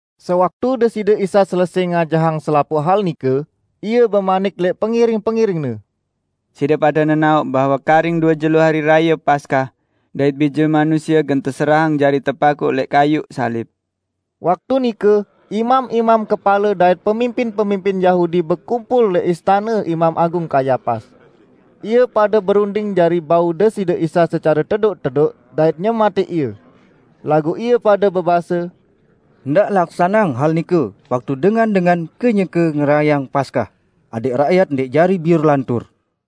Sewaktu Deside Isa selesẽ ngajahang selapuq hal nike, Ie bemanik lẽq pengiring-pengiring-Ne, "Side pade nenaoq, bahwe karing due jelo Hari Raye Paskah, dait Bije Manusie gen teserahang jari tepakuq lẽq kayuq salib." Waktu nike imam-imam kepale dait pemimpin-pemimpin Yahudi bekumpul lẽq istane Imam Agung Kayapas. Ie pade berunding jari bau Deside Isa secare tedoq-tedoq dait nyematẽq Ie. Laguq ie pade bebase, "Ndaq laksaneang hal nike waktu dengan-dengan kenyeke ngerayeang Paskah, adẽq rakyat ndẽq jari biur lantur."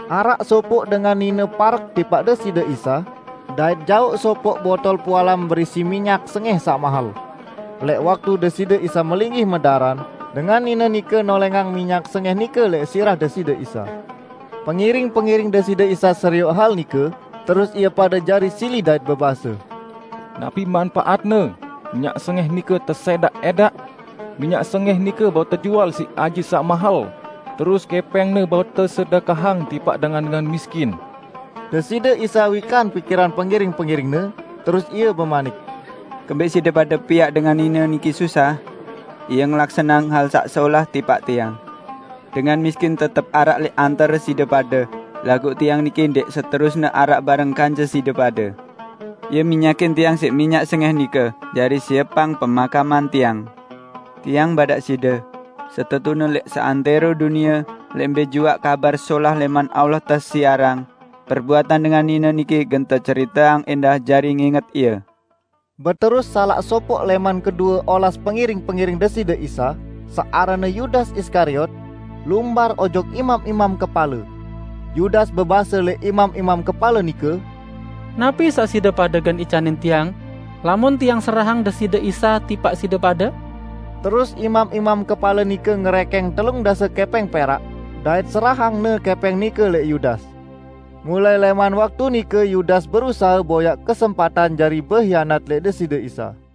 araq sopoq dengan nine parek tipaq Deside Isa, dait jauq sopoq botol pualam berisi minyak sengẽh saq mahel. Lẽq waktu Deside Isa melinggih medaran, dengan nine nike nolẽngang minyak sengẽh nike lẽq sirah Deside Isa. Pengiring-pengiring Deside Isa serioq hal nike, terus ie pade jari sili dait bebase, "Napi manpaatne minyak sengẽh nike tesẽdaq-ẽdaq?" "Minyak sengẽh nike bau tejual siq aji saq mahel, terus kẽpẽngne bau tesedekahang tipaq dengan-dengan miskin!" Deside Isa wikan pikiran pengiring-pengiring-Ne, terus Ie bemanik, "Kembẽq side pade piaq dengan nine niki susah? Ie ngelaksaneang hal saq solah tipaq Tiang. Dengan miskin tetep araq lẽq antare side pade, laguq Tiang niki ndẽq seterusne araq bareng kance side pade. Ie minyakin Tiang siq minyak sengẽh nike jari siepang pemakaman Tiang. Tiang badaq side: Setetune lẽq seantẽro dunie, lẽq mbẽ juaq Kabar Solah lẽman Allah tesiarang, perbuatan dengan nine niki gen teceriteang ẽndah jari nginget ie." Beterus salaq sopoq lẽman kedue olas pengiring-pengiring Deside Isa, saq aranne Yudas Iskariot, lumbar ojok imam-imam kepale. Yudas bebase lẽq imam-imam kepale nike, "Napi saq side pade gen icanin tiang lamun tiang serahang Deside Isa tipaq side pade?" Terus imam-imam kepale nike ngerẽkẽng telung dase kẽpẽng perak, dait serahangne kẽpẽng nike lẽq Yudas. Mulai lẽman waktu nike Yudas berusahe boyaq kesempatan jari behianat lẽq Deside Isa.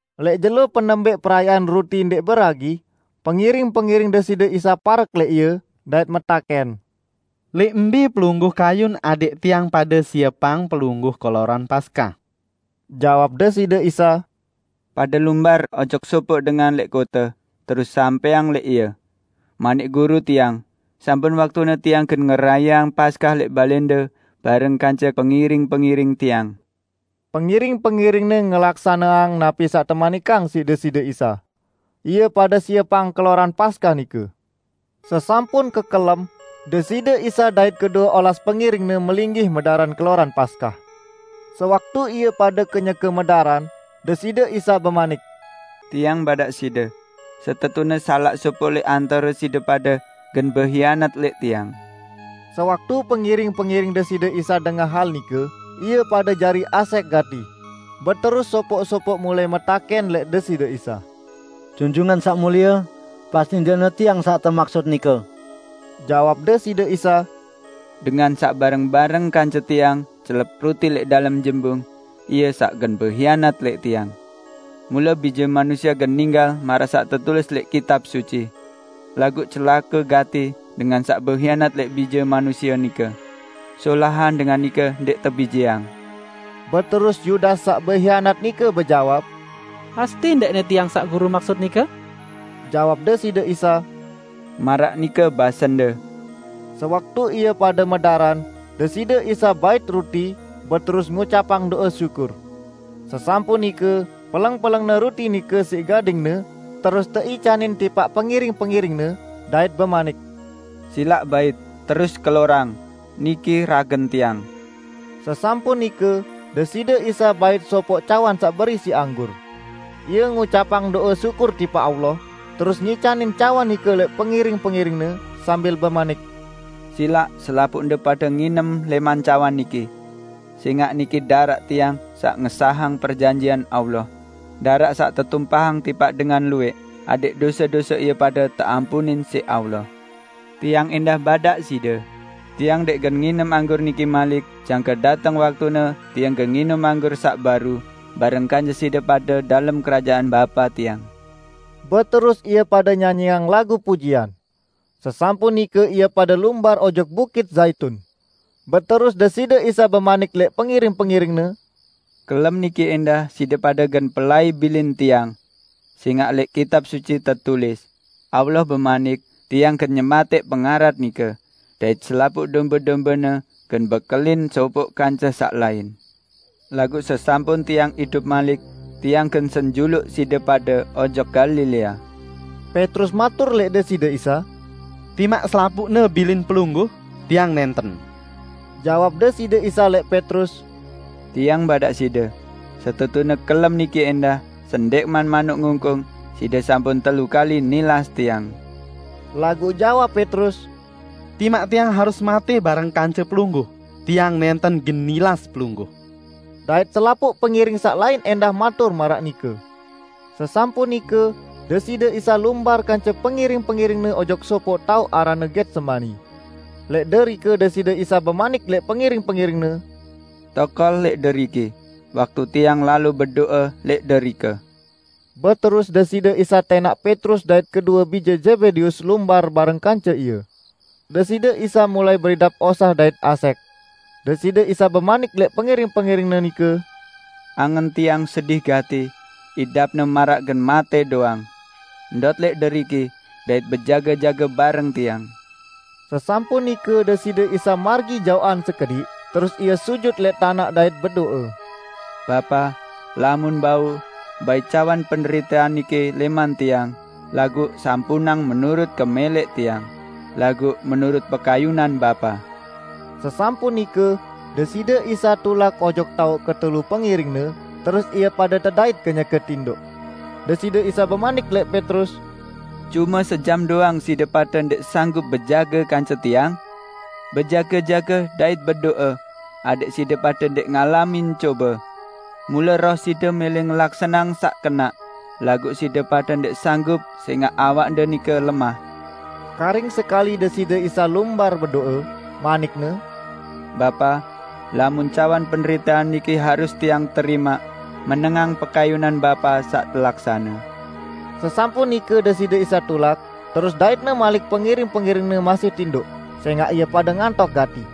Lẽq jelo penembẽq Perayaan Ruti Ndẽq Beragi, pengiring-pengiring Deside Isa parek lẽq Ie, dait metakẽn, "Lẽq mbẽ Pelungguh kayun adẽq tiang pade siepang Pelungguh keloran Paskah?" Jawab Deside Isa, "Pade lumbar ojok sopoq dengan lẽq kote, terus sampẽang lẽq ie, 'Manik Guru tiang, sampun waktune Tiang gen ngerayeang Paskah lẽq balẽnde bareng kance pengiring-pengiring Tiang.' " Pengiring-pengiring-Ne ngelaksaneang napi saq temanikang siq Deside Isa. Ie pade siepang keloran Paskah nike. Sesampun kekelem, Deside Isa dait kedue olas pengiring-Ne melinggih medaran keloran Paskah. Sewaktu ie pade kenyeke medaran, Deside Isa bemanik, "Tiang badaq side: Setetune salaq sopoq lẽq antare side pade gen behianat lẽq Tiang." Sewaktu pengiring-pengiring Deside Isa dengah hal nike, ie pade jari asẽq gati, beterus sopoq-sopoq mulai metakẽn lẽq Deside Isa, "Junjungan Saq Mulie, pasti ndẽqne tiang saq temaksut nike?" Jawab Deside Isa, "Dengan saq bareng-bareng kance Tiang celep ruti lẽq dalem jembung, ie saq gen behianat lẽq Tiang. Mule Bije Manusie gen ninggal maraq saq tetulis lẽq Kitab Suci. Laguq celake gati dengan saq behianat lẽq Bije Manusie nike! Solahan dengan nike ndẽq tebijeang!" Beterus Yudas saq behianat nike bejawab, "Pasti ndẽqne tiang saq Guru maksut nike?" Jawab Deside Isa, "Maraq nike basende!" Sewaktu ie pade medaran, Deside Isa bait ruti, beterus ngucapang do'e syukur. Sesampun nike, peleng-peleng-Ne ruti nike siq gading-Ne terus teicanin tipaq pengiring-pengiring-Ne, dait bemanik, "Silaq bait, terus kelorang; niki ragen Tiang." Sesampun nike, Deside Isa bait sopoq cawan saq berisi anggur. Ie ngucapang do'e syukur tipaq Allah, terus ngicanin cawan nike lẽq pengiring-pengiring-Ne, sambil bemanik, "Silaq selapuqde pade nginem lẽman cawan niki. Sẽngaq niki daraq Tiang saq ngesahang perjanjian Allah -- daraq saq tetumpahang tipaq dengan luwẽq adẽq dose-dose ie pade teampunin siq Allah. Tiang ẽndah badaq side: Tiang ndẽq gen nginem anggur niki malik jangke dateng waktune Tiang gen nginem anggur saq baru bareng kance side pade dalem Kerajaan Bapa Tiang." Beterus ie pade nyanyiang lagu pujian. Sesampun nike ie pade lumbar ojok Bukit Zaitun. Beterus Deside Isa bemanik lẽq pengiring-pengiring-Ne, "Kelem niki ẽndah side pade gen pelai bilin Tiang. Sẽngaq lẽq Kitab Suci tetulis: Allah bemanik, 'Tiang gen nyematẽq pengarat nike, dait selapuq dombe-dombene gen bekelin sopoq kance saq lain.' Laguq sesampun Tiang idup malik, Tiang gen senjuluq side pade ojok Galilea." Petrus matur lẽq Deside Isa, "Timaq selapuqne bilin Pelungguh, tiang nẽnten!" Jawab Deside Isa lẽq Petrus, "Tiang badaq side: Setetune kelem niki ẽndah, sendẽqman manuk ngungkung, side sampun telu kali nilas Tiang." Laguq jawab Petrus, "Timaq tiang harus matẽ bareng kance Pelungguh, tiang nẽnten gen nilas Pelungguh!" Dait selapuq pengiring saq lain ẽndah matur maraq nike. Sesampun nike, Deside Isa lumbar kance pengiring-pengiring-Ne ojok sopoq taoq aranne Getsemani. Lẽq derike Deside Isa bemanik lẽq pengiring-pengiring-Ne, "Tokol lẽq deriki, waktu Tiang lalo bedo'e lẽq derike." Beterus Deside Isa tẽnaq Petrus dait kedue bije Zebedeus lumbar bareng kance Ie. Deside Isa mulai beridap osah dait asẽq. Deside Isa bemanik lẽq pengiring-pengiring-Ne nike, "Angen Tiang sedih gati, idapne maraq gen matẽ doang. Ndot lẽq deriki, dait bejage-jage bareng Tiang." Sesampun nike Deside Isa margi jaoqan sekediq, terus Ie sujut lẽq tanaq dait bedo'e, "Bapa, lamun bau, bait cawan penderitean niki lẽman Tiang laguq sampunang menurut kemẽlẽq Tiang, laguq menurut pekayunan Bapa." Sesampun nike, Deside Isa tulak ojok taoq ketelu pengiring-Ne terus ie pade tedait kenyeke tindoq. Deside Isa bemanik lẽq Petrus, "Cume sejam doang side pade ndẽq sanggup bejage kance Tiang? Bejage-jage dait bedo'e, adẽq side pade ndẽq ngalamin cobe. Mule roh side mẽlẽ ngelaksaneang saq kenaq, laguq side pade ndẽq sanggup sẽngaq awakde nike lemah." Karing sekali Deside Isa lumbar bedo'e, manik-Ne, "Bapa, lamun cawan penderitean niki harus Tiang terimaq, menengang pekayunan Bapa saq telaksane." Sesampun nike Deside Isa tulak, terus dait-Ne malik pengiring-pengiring-Ne masih tindoq, sẽngaq ie pade ngantok gati.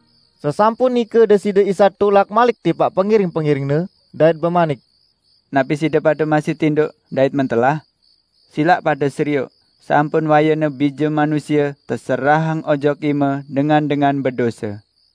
Sesampun nike Deside Isa tulak malik tipaq pengiring-pengiring-Ne, dait bemanik, "Napi side pade masih tindoq dait mentelah? Silaq pade serioq, sampun wayene Bije Manusie teserahang ojok ime dengan-dengan bedose.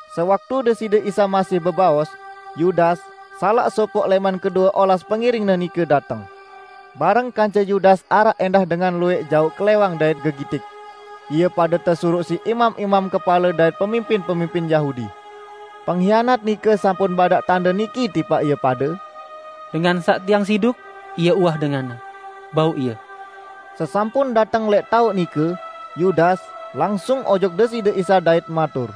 Sewaktu Deside Isa masih bebaos, Yudas, salaq sopoq lẽman kedue olas pengiring-Ne nike dateng. Bareng kance Yudas araq ẽndah dengan luwẽq jauq klẽwang dait gegitik. Ie pade tesuruq siq imam-imam kepale dait pemimpin-pemimpin Yahudi. Penghianat nike sampun badaq tande niki tipaq ie pade, "Dengan saq tiang siduk, Ie uwah denganne. Bau Ie!" Sesampun dateng lẽq taoq nike, Yudas, langsung ojok Deside Isa dait matur,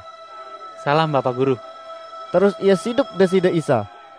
"Salam Bapaq Guru!" Terus ie siduk Deside Isa.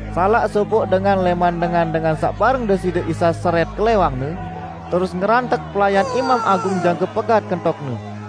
Salaq sopoq dengan lẽman dengan-dengan saq bareng Deside Isa serẽt klẽwangne, terus ngerantek pelayan Imam Agung jangke pegat kentokne.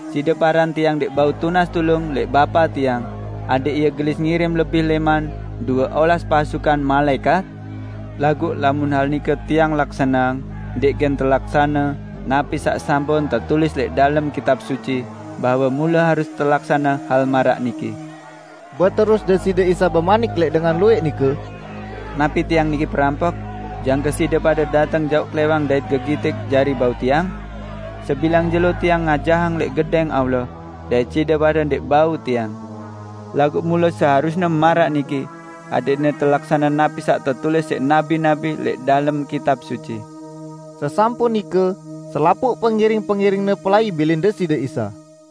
Side paran Tiang ndẽq bau tunas tulung lẽq Bapa Tiang, adẽq Ie gelis ngirim lebih lẽman due olas pasukan malaẽkat? Laguq lamun hal nike Tiang laksaneang, ndẽq gen telaksane napi saq sampun tetulis lẽq dalem Kitab Suci bahwe mule harus telaksane hal maraq niki?" Beterus Deside Isa bemanik lẽq dengan luwẽq nike, "Napi Tiang niki perampok, jangke side pade dateng jauq klẽwang dait gegitik jari bau Tiang? Sebilang jelo Tiang ngajahang lẽq Gedẽng Allah, dait side pade ndẽq bau Tiang. Laguq mule seharusne maraq niki, adẽqne telaksane napi saq tetulis siq nabi-nabi lẽq dalem Kitab Suci." Sesampun nike, selapuq pengiring-pengiring-Ne pelai bilin Deside Isa.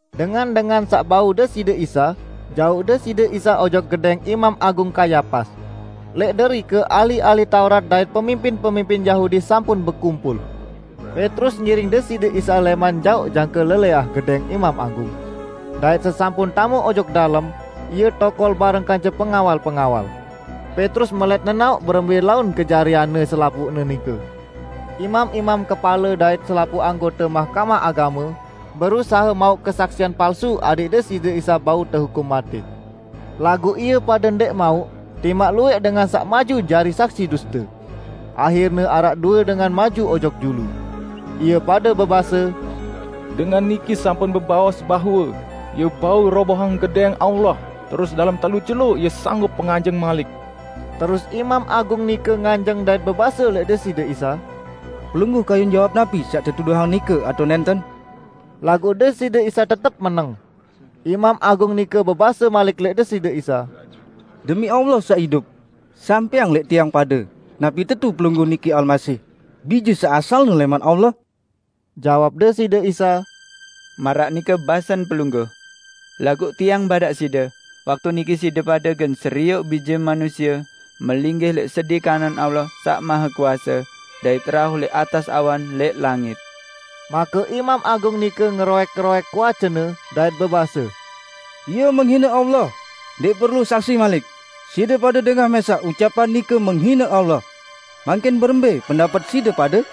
Dengan-dengan saq bau Deside Isa jauq Deside Isa ojok gedẽng Imam Agung Kayapas. Lẽq derike ahli-ahli Taurat dait pemimpin-pemimpin Yahudi sampun bekumpul. Petrus ngiring Deside Isa lẽman jaoq jangke lelẽah gedẽng Imam Agung. Dait sesampun tame ojok dalem, ie tokol bareng kance pengawal-pengawal. Petrus melẽt nenaoq berembẽ laun kejarianne selapuqne nike. Imam-imam kepale dait selapuq anggote Mahkamah Agame berusahe mauq kesaksian palsu adẽq Deside Isa bau tehukum matẽ. Laguq ie pade ndẽq mauq, timaq luwẽq dengan saq maju jari saksi duste. Ahirne araq due dengan maju ojok julu. Ie pade bebase, "Dengan niki sampun bebaos bahwe, 'Ie bau robohang Gedẽng Allah, terus dalem telu jelo Ie sanggup penganjeng malik.' " Terus Imam Agung nike nganjeng dait bebase lẽq Deside Isa, "Pelungguh kayun jawab napi saq tetuduhang nike atao nẽnten?" Laguq Deside Isa tetep meneng. Imam Agung nike bebase malik lẽq Deside Isa, "Demi Allah saq idup, sampẽang lẽq tiang pade napi tetu Pelungguh niki Almasih, Bije saq asalne lẽman Allah?" Jawab Deside Isa, "Maraq nike basen pelungguh. Laguq Tiang badaq side waktu niki side pade gen serioq Bije Manusie melinggih lẽq sedi kanan Allah saq Mahekuase, dait rauh lẽq atas awan lẽq langit!" Make Imam Agung nike ngeroẽk-roẽk kuacene, dait bebase, "Ie menghine Allah! Ndẽq perlu saksi malik. Side pade dengah mẽsaq ucapan nike menghine Allah. Mangkin berembẽ pendapet side pade?"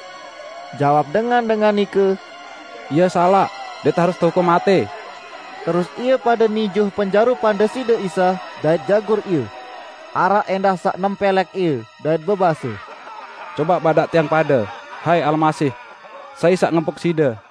Jawab dengan-dengan nike, "Ie salaq, dait harus tehukum matẽ." Terus ie pade nijuh penjarupan Deside Isa, dait jagur Ie. Araq ẽndah saq nempẽlẽk Ie, dait bebase, "Cobaq badaq tiang pade, hai Almasih! Sai saq ngempuk Side?"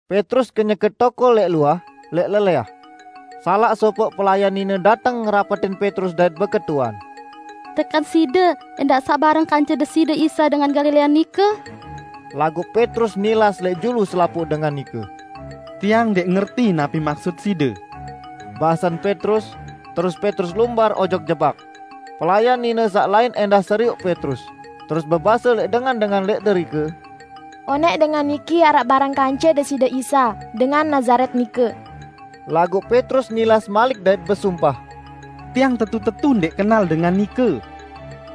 Petrus kenyeke tokol lẽq luah, lẽq lelẽah. Salaq sopoq pelayan nine dateng ngerapetin Petrus dait beketuan, "Tekan side ẽndah saq bareng kance Deside Isa dengan Galilea nike?" Laguq Petrus nilas lẽq julu selapuq dengan nike. "Tiang ndẽq ngerti napi maksut side," basen Petrus, terus Petrus lumbar ojok jebak. Pelayan nine saq lain ẽndah serioq Petrus, terus bebase lẽq dengan-dengan lẽq derike, "Onẽq dengan niki araq bareng kance Deside Isa dengan Nazaret nike." Laguq Petrus nilas malik dait besumpah, "Tiang tetu-tetu ndẽq kenal dengan nike!"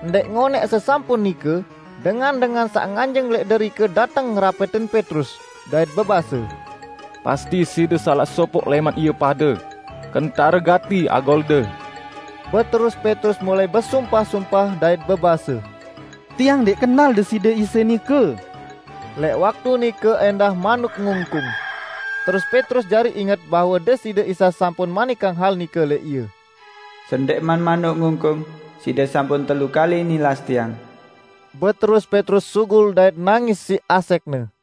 Ndẽq ngonẽq sesampun nike, dengan-dengan saq nganjeng lẽq derike dateng ngerapetin Petrus, dait bebase, "Pasti side salaq sopoq lẽman ie pade. Kentare gati agolde." Beterus Petrus mulai besumpah-sumpah, dait bebase, "Tiang ndẽq kenal Deside Isa nike!" Lẽq waktu nike ẽndah manuk ngungkung. Terus Petrus jari inget bahwe Deside Isa sampun manikang hal nike lẽq ie, "Sendẽqman manuk ngungkung, side sampun telu kali nilas Tiang." Beterus Petrus sugul dait nangis siq asẽqne.